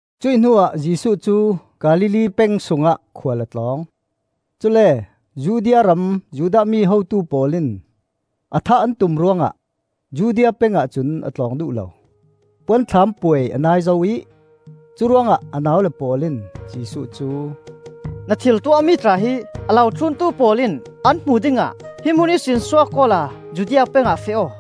Cuih hnuah Jesuh cu Galilee peng sungah khual a tlawng; cule Judea ram Judah mi hotu pawl in a thah an tum ruangah Judea peng ahcun a tlawng duh lo. Puanthlam Puai a nai zo ih, curuangah a naule pawl in Jesuh cu, “Na thil tuahmi tla hi a lo thluntu pawl in an hmuh dingah hi hmun ihsin suak awla Judea peng ah feh aw.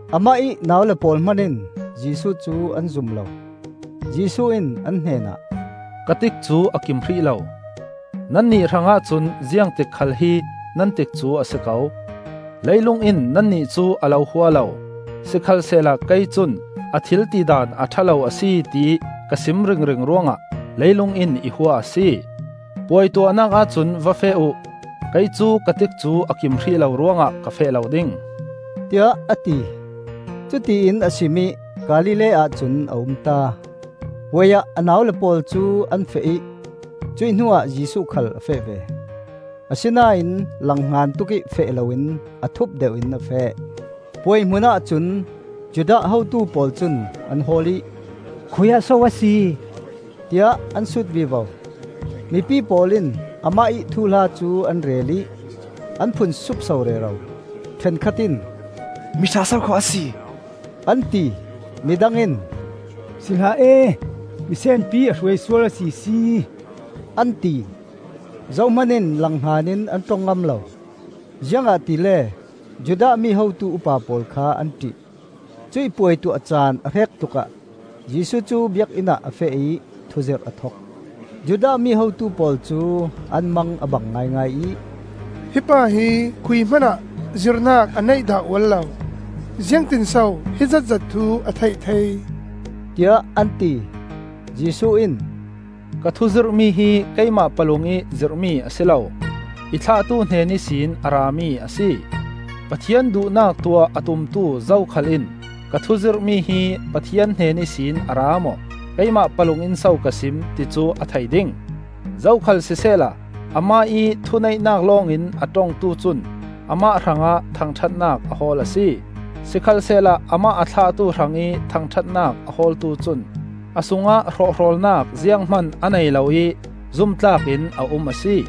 Amah ih naule pawl hman in Jesuh cu an zum lo. Jesuh in an hnenah, “Ka tikcu a kim hrih lo. Nannih hrangah cun ziangtik khal hi nan tikcu a si ko. Leilung in nannih cu a lo hua lo, sikhalsehla kei cun a thil tidan a ṭha lo a si tiih ka sim ringring ruangah leilung in i hua a si. Puai tuahnak ahcun va feh uh. Kei cu ka tikcu a kim hrih lo ruangah ka feh lo ding,” tiah a ti. Cutiin a sim ih Galilee ahcun a umta. Puai ah a naule pawl cu an feh ih cuih hnuah Jesuh khal a feh ve; asinain langhngan tukih feh loin a thup deuh in a feh. Puai hmun ahcun Judah hotu pawl cun an hawl ih, “Khui-ah so a si?” tiah an sut vivo. Mipi pawl in amah ih thuhla cu an rel ih an phun supso rero. Ṭhenkhat in, “Miṭha sokhaw a si!” an ti. Midang in, “Si hlah e, misenpi a hruai sual a sisi!” an ti. Zohman in langhngan in an ṭong ngam lo, ziangahtile Judah mi hotu upa pawl kha an ṭih. Cuih puai tuah caan a hrek tlukah Jesuh cu Biakinn ah a feh ih thuzirh a thok. Judah mi hotu pawl cu an mang a bang ngaingai ih, “Hi pa hi khui hmanah zirnak a neih dah ual lo; ziangtinso hi zatzat thu a theih thei?” tiah an ti. Jesuh in, “Ka thuzirhmi hi keimah palungih zirhmi a si lo; i thlahtu hnen ihsin a rami a si. Pathian duhnak tuah a tumtu zokhal in ka thuzirhmi hi Pathian hnen ihsin a ra maw, keimah palung in so ka sim, ti cu a thei ding. Zokhal sisehla amah ih thuneihnak lawngin a ṭongtu cun amah hrangah thangṭhatnak a hawl a si. Sikhalsehla amah a thlahtu hrangih thangṭhatnak a hawltu cun a sungah hrawhhrawlnak zianghman a nei lo ih zumtlak in a um a si.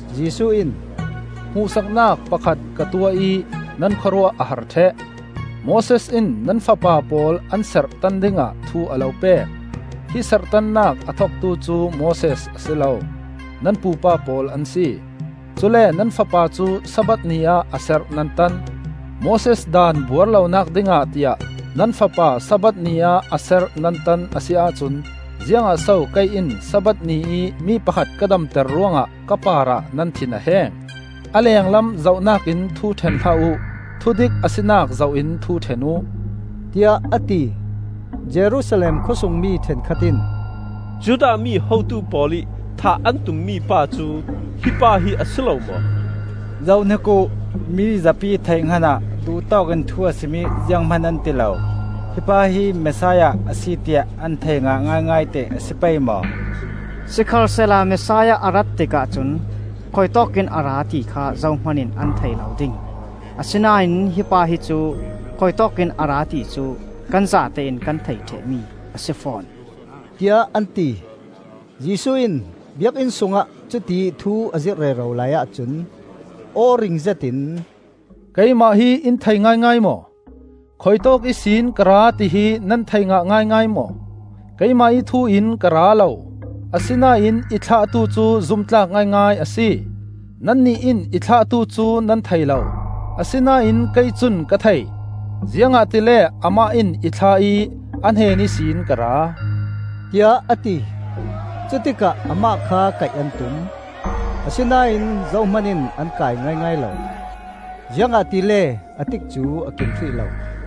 Jesuh in, “Hmuhsaknak pakhat ka tuah ih nan khawruah a har ṭheh. Moses in nan fapa pawl an serh tan dingah thu a lo pek, (hi serhtannak a thoktu cu Moses a si lo, nan pupa pawl an si); cule nan fapa cu Sabbath ni ah a serh nan tan. Moses Daan buar lonak dingah tiah nan fapa Sabbath ni ah a serh nan tan a si ahcun ziangah so kei in Sabbath ni ih mi pakhat ka damter ruangah ka parah nan thin a heng? A lenglam zohnakin thu ṭhen hlah uh; thudik a sinak zoh in thu ṭhen uh,” tiah a ti. Messiah A si Maw? Jerusalem khawsungmi ṭhenkhat in, “Judah mi hotu pawl ih thah an tummi pa cu hi pa hi a si lo maw? Zohhnik uh! Mi zapi theihhngan ah duh tawkin thu a sim ih zianghman an ti lo. Hi pa hi Messiah a si tiah an thei ngah ngaingai teh a si pei maw? Sikhalsehla Messiah a rat tikah cun khuitawkin a ra, ti kha zohman in an thei lo ding; asinain hi pa hi cu khuitawk in a ra ti cu kan zatein kan theih ṭheh mi a si fawn,” tiah an ti. Jesuh in Biakinn sungah cutiih thu a zirh rero laiah cun, aw ring zetin, “Keimah hi in thei ngaingai maw? Khuitawk ihsin ka ra ti hi nan thei ngah ngaingai maw? Keimah ih thu in ka ra lo. Asinain i thlahtu cu zumtlak ngaingai a si. Nannih in i thlahtu cu nan thei lo, asinain kei cun ka thei, ziangahtile amah in i thlah ih a hnen ihsin ka ra,” tiah a ti. Cutikah amah kha kaih an tum, asinain zohman in an kai ngaingai lo; ziangahtile a tikcu a kim hrih lo.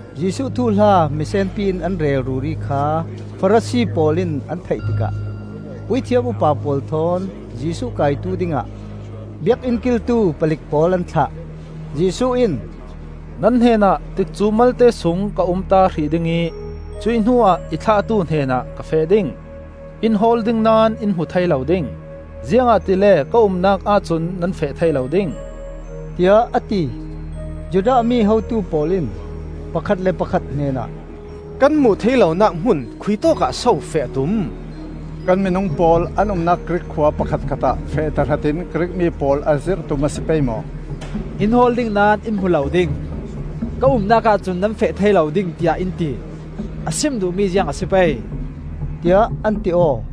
Jesuh thuhla misenpi in an rel ruri kha Farasi pawl in an theih tikah puithiam upa pawl thawn Jesuh kaitu dingah biakinn kiltu palik pawl an thlah. Jesuh in, “Nan hnenah tikcu malte sung ka umta hrih ding ih cuih hnuah i thlahtu hnenah ka feh ding. In hawl ding naón in hmu thei lo ding, ziangahtile ka umnak ahcun nan feh thei lo ding,” tiah a ti. Judah mi hotu pawl in pakhat le pakhat hnenah, “Kan hmuh thei lonak hmun khuitawkah so feh a tum? Kan minung pawl an umnak Grik khua pakhatkhat ah feh tahratin Grik mi pawl a zirh tum a si pei maw? ‘In hawl ding naón in hmu lo ding. Ka umnak ahcun nan feh thei lo ding,’ tiah in ti. A sim duhmi ziang a si pei?” tiah an ti aw.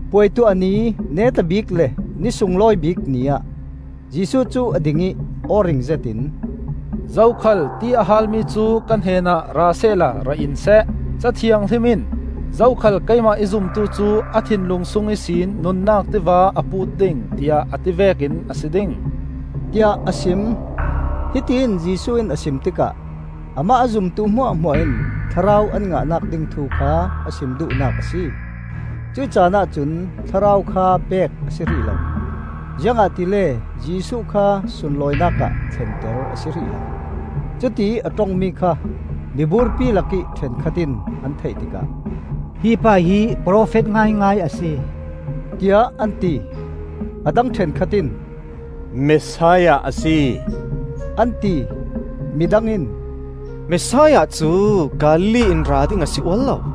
Puai tuah ni neta bik le ni sunglawi bik ni ah Jesuh cu a ding ih aw ring zetin, “Zokhal ti a haal mi cu ka hnenah ra sehla ra in seh. Ca Thianghlim in ‘Zokhal keimah i zumtu cu a thinlung sung ihsin nunnak tiva a put ding,’ tiah a ti vekin a si ding,” tiah a sim. Hitiin Jesuh in a sim tikah amah a zumtu hmuahhmuah in Thlarau an ngahnak ding thu kha a sim duhnak a si. Cuih caan ahcun Thlarau kha pek a si hrih lo, ziangahtile Jesuh kha sunlawinak ah thlenter a si hrih lo. Cutiih a ṭongmi kha miburpi lakih ṭhenkhat in an theih tikah, “Hi pa hi profet ngaingai a si,” tiah an ti. A dang ṭhenkhat in, “Messiah a si,” an ti. Midang in, “Messiah cu Galilee in ra ding a si ual lo!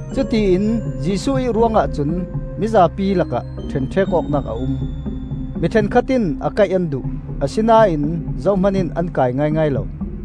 Cutiin Jesuh ih ruangah cun mizapi lakah ṭhenṭhek awknak a um. Mi ṭhenkhat in a kaih an duh, asinain zohman in an kai ngaingai lo.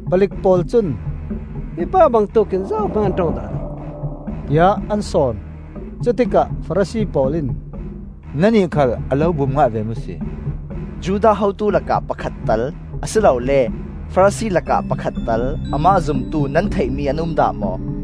Palik pawl cun, “Hi pa bangtuk in zohman an ṭong dah lo,” tiah an sawn. Cutikah Farasi pawl in, “Nannih khal a lo bum ngah ve maw si? Judah hotu lakah pakhat tal, a si lole Farasi lakah pakhat tal amah zumtu nan theihmi an um dah maw?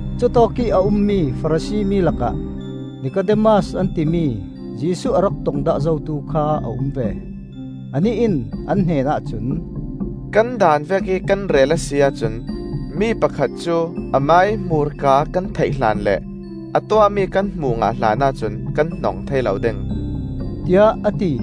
Cutawkih a ummi Farasi mi lakah Nikodemas an timi, Jesuh a rak tong dah zotu kha a um ve. Anih in an hnenah cun, “Kan Daan vekih kan rel a si ahcun mi pakhat cu amah ih hmurka kan theih hlan le a tuahmi kan hmuh ngah hlan ahcun kan hnong thei lo ding,” tiah a ti.